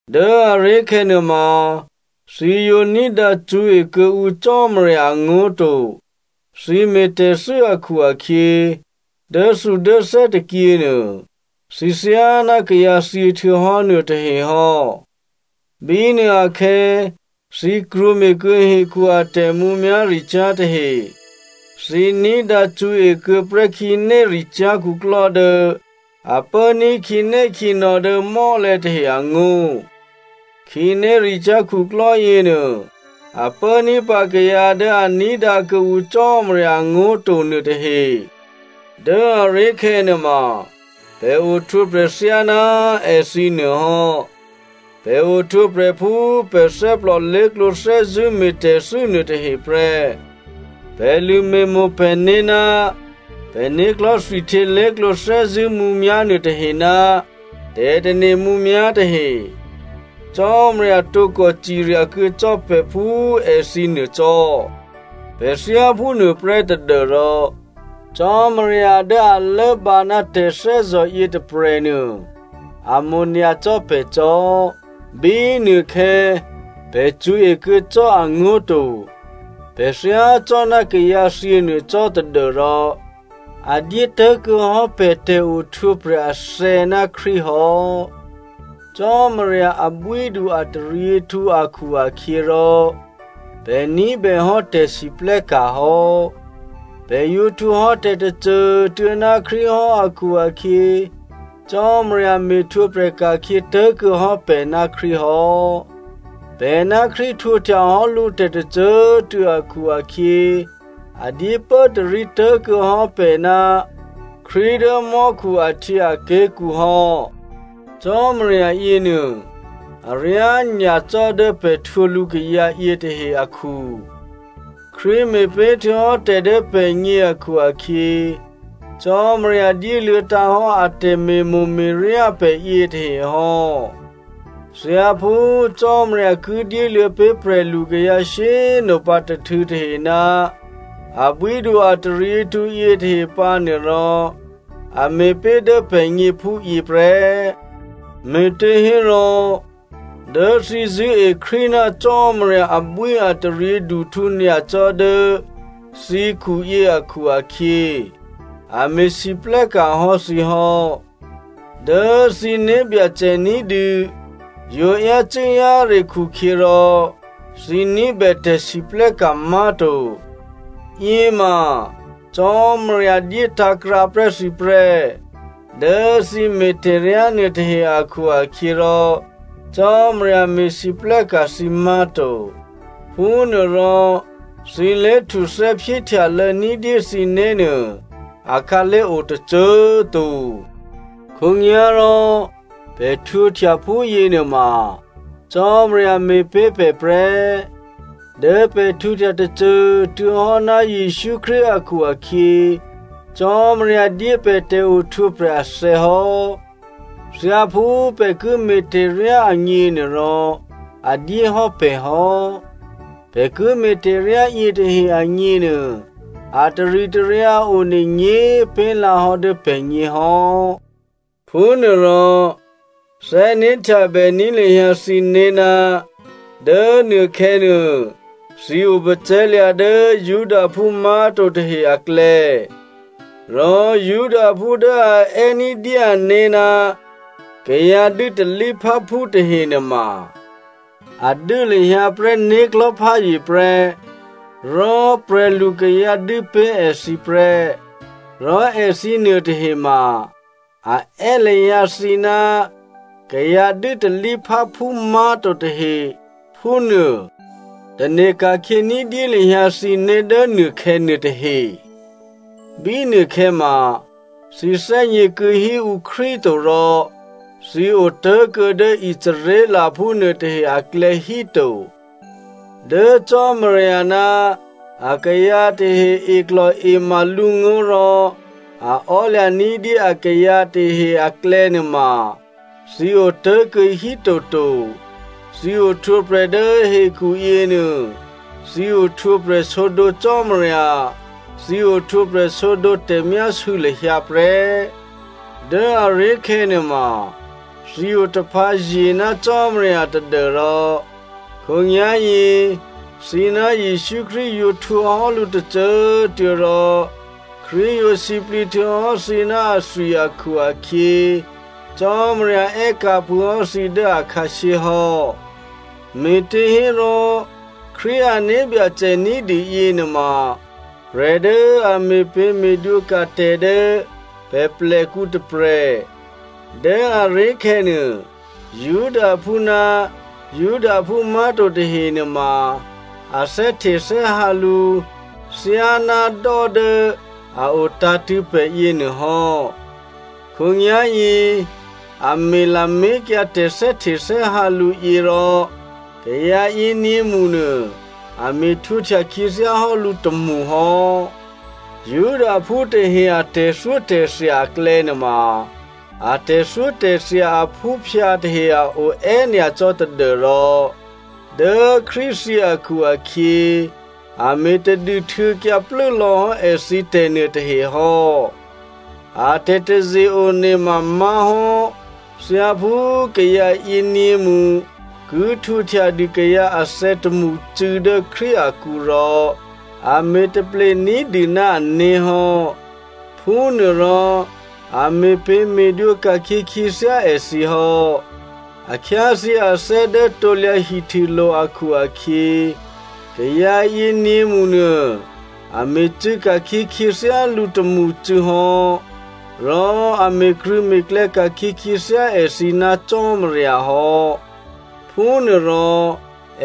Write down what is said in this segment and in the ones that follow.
Dố aré̤khè̌ nuôma, thǐ yǒ ní̤dǎ cṳ̌e kuô̌ǔ Cò́marya angó̤ to, thǐ me̤ tè̤thû́ akhu-akhyě, dốthudốthè́ tôkyěnuô, thǐ thyáná kayǎ thyěhtuô̌hò́ nuôtahe hò́. Bínuôakhè̌, thǐ krwǒme̤kuô̌ hekhu a tè̤mǔmyá̤ricyá̤ tahe. Thǐ ní̤dǎ cṳ̌e kuô̌ prè́ khǐnéricyá̤ khuklò́ dố a pốní̤ khǐnékhǐnò̌ dố mò́lè̤̌ tahe angó̤. Khǐnéricyá̤ khuklò́ yěnuô, a pốní̤pǎ kayǎ dố a ní̤dǎ kuô̌ǔ Cò́marya angó̤ to nuôtahe. Dố꤮ aré̤khè̌ nuôma, pè̤ ohtwǒprè̤ thyáná èthǐ nuôhò́. Pè̤ ohtwǒprè̤ phú pè̤ thè́plò lé̤klǒ thè́zṳ̂́ me̤tè̤thû́ nuôtahe prè́. Pè̤ lṳ̂me̤mo̤ pè̤né̤ ná pè̤né̤klò̤́ thwihtyě lé̤klǒ thè́zṳ̂́ mǔmyá̤ nuôtahe ná tè̤tane̤ mǔmyá̤ tahe. Cò́marya tǒkò cirya kuô̌ cò́ pè̤ phú èthǐ nuô cò́. Pè̤ thyáphúnuô prè́ tadû́rò, Cò́marya dố a lốbǎ ná tè̤thè́zò̤ yětôprè̤nuô a mo̤ nyacò́ pè̤ cò́. Bínuôkhè̌ pè̤ cṳ̌e kuô̌ cò́ angó̤ to, pè̤ thyácò́ná kayǎthyě nuô cò́ tadû́rò a dyé tố̤kuô̌ hò́ pè̤ tè̤ohtwǒprè̤ athè̌ ná Krístu hò́. Cò́marya abwídu-ataryěhtǔ akhu-akhyěrò, pè̤ ní̤bèhò́ tè̤siplè́ka̤ hò́. Pè̤ yǒ htwǒhò́ tè̤tôcô꤮ tuô̌ ná Krístu hò́ akhu-akhyě, Cò́marya me̤htwǒprè̤ ka̤khyě tố̤kuô̌ hò́ pè̤ ná Krístu hò́. Pè̤ ná Krístu htwǒhtyahò́ lǔ tè̤tôcô꤮ tuô̌ akhu-akhyě, a dyé pốtarí tố̤kuô̌ hò́ pè̤ ná Krístu dố mò́khu ahtyěaké̤kǔ hò́. Cò́marya yěnuô aryá nyacò́ dố pè̤ htwǒ lǔkayǎ yětahe akhu. Krístu me̤pé̤ htuô̌hò́ tè̤ dố pè̤gně akhu-akhyě, Cò́marya dyéluô̌tǎ̤ hò́ a tè̤me̤mo̤me̤ryá pè̤ yětahe hò́. Thyáphú Cò́marya ki dyéluô̌ pé̤ prè̤lukayǎ shyé꤮ nopǎ tôhtû̌ tahe ná abwídu-ataryěhtǔ yětahe pǎnuô rò, a me̤ pé̤ dố pè̤gně phúyě prè́. Me̤těhérò, dố thǐ zṳ̂́e Krístu ná Cò́marya abwíataryěduhtǔ nyacò́ dố thǐkhuyě akhu-akhyě, a me̤lwóhteka̤ hò́ thǐ hò́. Dố thǐ né̤byacè ní̤dû yǒ yácû́-yáre khukhyě rò thǐ ní̤bè tè̤lwóhteka̤ má̤to. Yěma Cò́marya dyétǎ̤krǎ prè́ thǐ prè́. Dố thǐ me̤ tè̤ryá nuôtahe akhu-akhyěrò Cò́marya me̤lwóhteka̤ thǐ má̤to. Phúnuôrò, thǐ lé̤htuthè́ phyéhtyalô̌ ní̤dyé thǐné̤nuô, akhǎlé̤ o tôcô꤮ to. Khǒnyá̤rò pè̤ htwǒhtya phúyě nuôma, Cò́marya me̤pé̤ pè̤ prè́. Dố pè̤ htwǒhtya tôcô꤮ tuô̌ hò́ ná Jesǔ Krístu akhu-akhyě Cò́marya dyé pè̤ tè̤ohtwǒprè̤ athè̌ hò́. Thyáphú pè̤ ki me̤tè̤ryá agněnuôrò, a dyé hò́ pè̤ hò́. Pè̤ ki me̤ tè̤ryá yětahe agněnuô, a taritaryǎ one nyě̤꤮ pé̤lǎhò́ dố pè̤gně hò́. Phúnuôrò, thè́né̤htyabèní̤ lahyǎ thǐné̤ ná dố nuôkhè̌ nuô, thǐ opacè̤̌lya̤ dố Judaphú má̤to tahe aklè̌. Rò Judaphú dố a è́ ní̤dyé ané̤ ná kayǎ dû́talípháphú tahenuôma, a dû́ lahyǎ prè́ né̤klò̤́ pházye prè́, rò prè̤lukayǎ dû́ pé̤ èthǐ prè́. Rò èthǐ nuôtahe ma a è́ lahyǎ thǐ, “Kayǎ dû́talípháphú má̤to tahe,” phúnuô. Tane̤ ka̤khyě ní̤dyé lahyǎ thǐné̤ dố nuôkhè̌ nuôtahe, bínuôkhè̌ ma thǐ thè́gně kuô̌híǔ Krístu to, rò thǐ otố̤kuô̌ dố Israelphú nuôtahe aklè̌ híto. Dố Cò́marya ná akayǎ tahe eklò̤ema lǔngó̤ rò a ò́lya̤ ní̤dyé akayǎ tahe aklè̌nuôma, thǐ otố̤kuô̌ hítoto. Thǐ ohtwǒprè̤ dố hekhuyě nuô, thǐ ohtwǒprè̤ sǒdǒ Cò́marya, thǐ ohtwǒprè̤ sǒdǒ tè̤myásû̌ lahyǎ prè́. Dố aré̤khè̌ nuôma, thǐ otaphǎzye ná Cò́marya tadû́rò khǒnyá̤yě thǐ ná Jesǔ Krístu yǒ htwǒhò́ lǔ tôcô꤮ tuô̌ rò Krístu yǒ sǐplǐ htuô̌hò́ thǐ ná athwi akhu-akhyě Cò́marya è́ka̤ phûhò́ thǐ dố akhǎshyé hò́. Me̤těhérò, Krístu ané̤ Byacè ní̤dû yěnuôma prè̤ dố a me̤pě̤me̤dwǒka̤ tè̤ dố pè̤plèkǔ tôprè̤. Dố aré̤khè̌nuô, Judaphú ná Judaphú má̤to tahe nuôma a thè́htethè́hǎ lǔ thyáná dò́ dố a o tǎ̤tṳ̂̌ pè̤ yěnuô hò́. Khǒnyá̤yě a me̤ lamé̤kyǎ tè̤thè́htethè́hǎ lǔ yě, rò kayǎ yěnyě̤mṳnuô a me̤htwǒhtya khyěthyá hò́ lǔ tômṳhò́. Judaphú tahe a tè̤thyótè̤thya aklè̌nuôma a tè̤thyótè̤thya aphúphyǎ tahe a o è́nyacò́ tadû́rò dố Krístu thyě akhu-akhyě a me̤ tadû htuô̌kyǎ plû́lò̌hò́ èthǐ tè̤ nuôtahe hò́. A tè̤taze-one ma má̤hò́, thyáphú kayǎ yěnyě̤mṳ ki htwǒhtyadû kayǎ athè̌ tômṳcû̌ dố Krístu akǔ rò, a me̤ taple ní̤dû ná ané̤ hò́. Phúnuôrò a me̤pě̤me̤dwǒ ka̤khyě khyěthyá èthǐ hò́. A khyáthyě athè́ dố krusulo̤ akhu-akhyě, kayǎ yěnyě̤mṳnuô a me̤cû̌ ka̤khyě khyěthyálǔ tômṳcû̌ hò́, rò a me̤krṳ̂̌me̤klè̌ ka̤khyě khyěthyá èthǐ ná Cò́marya hò́. Phúnuôrò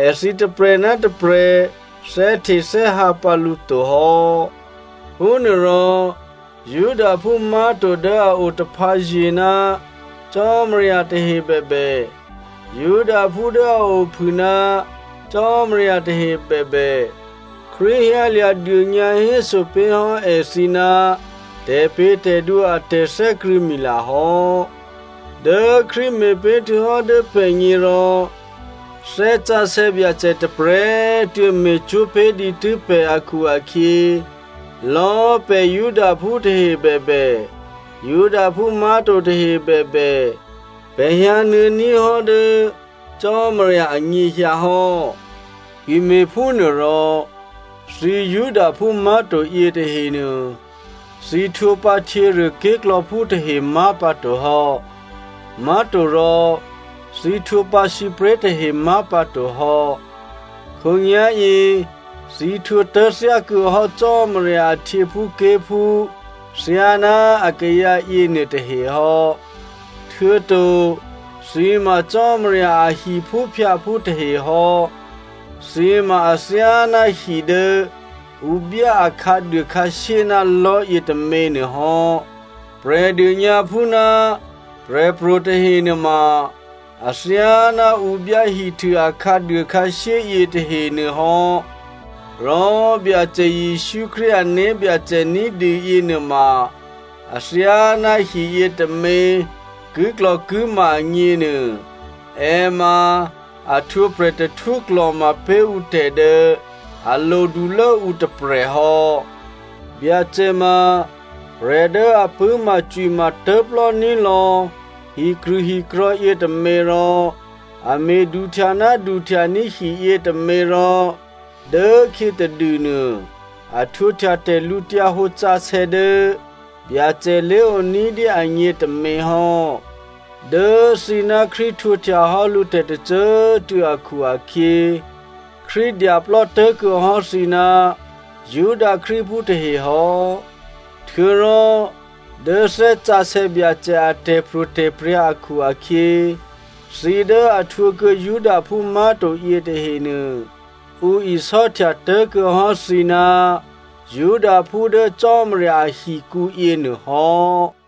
èthǐ tôprè̤ ná tôprè̤ thè́htethè́hǎ pǎ lǔ to hò́. Phúnuôrò Judaphú má̤to dố a o taphǎye̤ ná Cò́marya tahe bèbè, Judaphú dố a ophû ná Cò́marya tahe bèbè, Krístu hyǎlya̤ dônyǎhéso pé̤hò́ èthǐ ná tè̤pě̤tè̤dwǒ a tè̤thè́krṳ̂̌mila hò́. Dố Krístu me̤ pé̤ htuô̌hò́ dố pè̤gně rò Thè́ Sǎsè̌ Byacè tôprè̤꤮ tuô̌ me̤cwó̤ pé̤ dǐtû́ pè̤ akhu-akhyě, lò̌꤮ pè̤ Judaphú tahe bèbè, Judaphú má̤to tahe bèbè, pè̤ hyǎnuô̌ní̤ hò́ dố Cò́marya anyěhyǎ hò́. Ki me̤phúnuôrò, thǐ Judaphú má̤to yětahenuô, thǐ htwǒpǎ htyěruôké̤klò̌phú tahe má̤pǎto hò́, má̤torò thǐ htwǒpǎ sǐpré̤ tahe má̤pǎto hò́. Khǒnyá̤yě thǐ htwǒtố̤ thyákuô̌hò́ Cò́marya a htyěphúké̤phú thyáná akayǎ yěnuôtahe hò́. Htuô̌to thǐ ma Cò́marya a hiphúphyǎphú tahe hò́. Thǐ ma athyáná hi dố ǔ byá a khǎduôkhǎshyé ná lò̤́ yětômě nuôhò́. Prè̤dônyǎphú ná prè̤pro̤ tahe nuôma athyáná ǔ byá hihtû a khǎduôkhǎshyé yětahenuô hò́. Rò Byacè Jesǔ Krístu ané̤byacè ní̤dû yěnuôma athyáná hiyě tômě kiklò̤kima agněnuô è ma a htwǒ prè̤tahtwó klò̤ma pé̤ ǔ tè̤ dố a lodulố ǔ tôprè̤ hò́. Byacè ma prè̤ dố a pṳ̂́macwima tố̤plò́ní̤ lò̌ hikrṳ̂hikrò̤̌ yětômě rò a me̤duhtya ná duhtya ní̤ hi yětômě rò dốkhyětadûnuô, a htwǒhtya tè̤lǔhǒdusǎsè̌ dố Byacè lé̤oní̤dyé agně tômě hò́. Dố thǐ ná Krístu htwǒhtya hò́ lǔ tè̤tôcô꤮ tuô̌ akhu-akhyě, Krístu dyaplò́tố̤ kuô̌hò́ thǐ ná Juda Krístuphú tahe hò́. Htuô̌rò dố Thè́ Sǎsè̌ Byacè a tè̤pro̤tè̤prya̤ akhu-akhyě, thǐ dố a htwǒkuô̌ Judaphú má̤to yětahenuô, ǔ isò́htya tố̤kuô̌ hò́ thǐ ná Judaphú dố Cò́marya ahikǔ yěnuôhò́.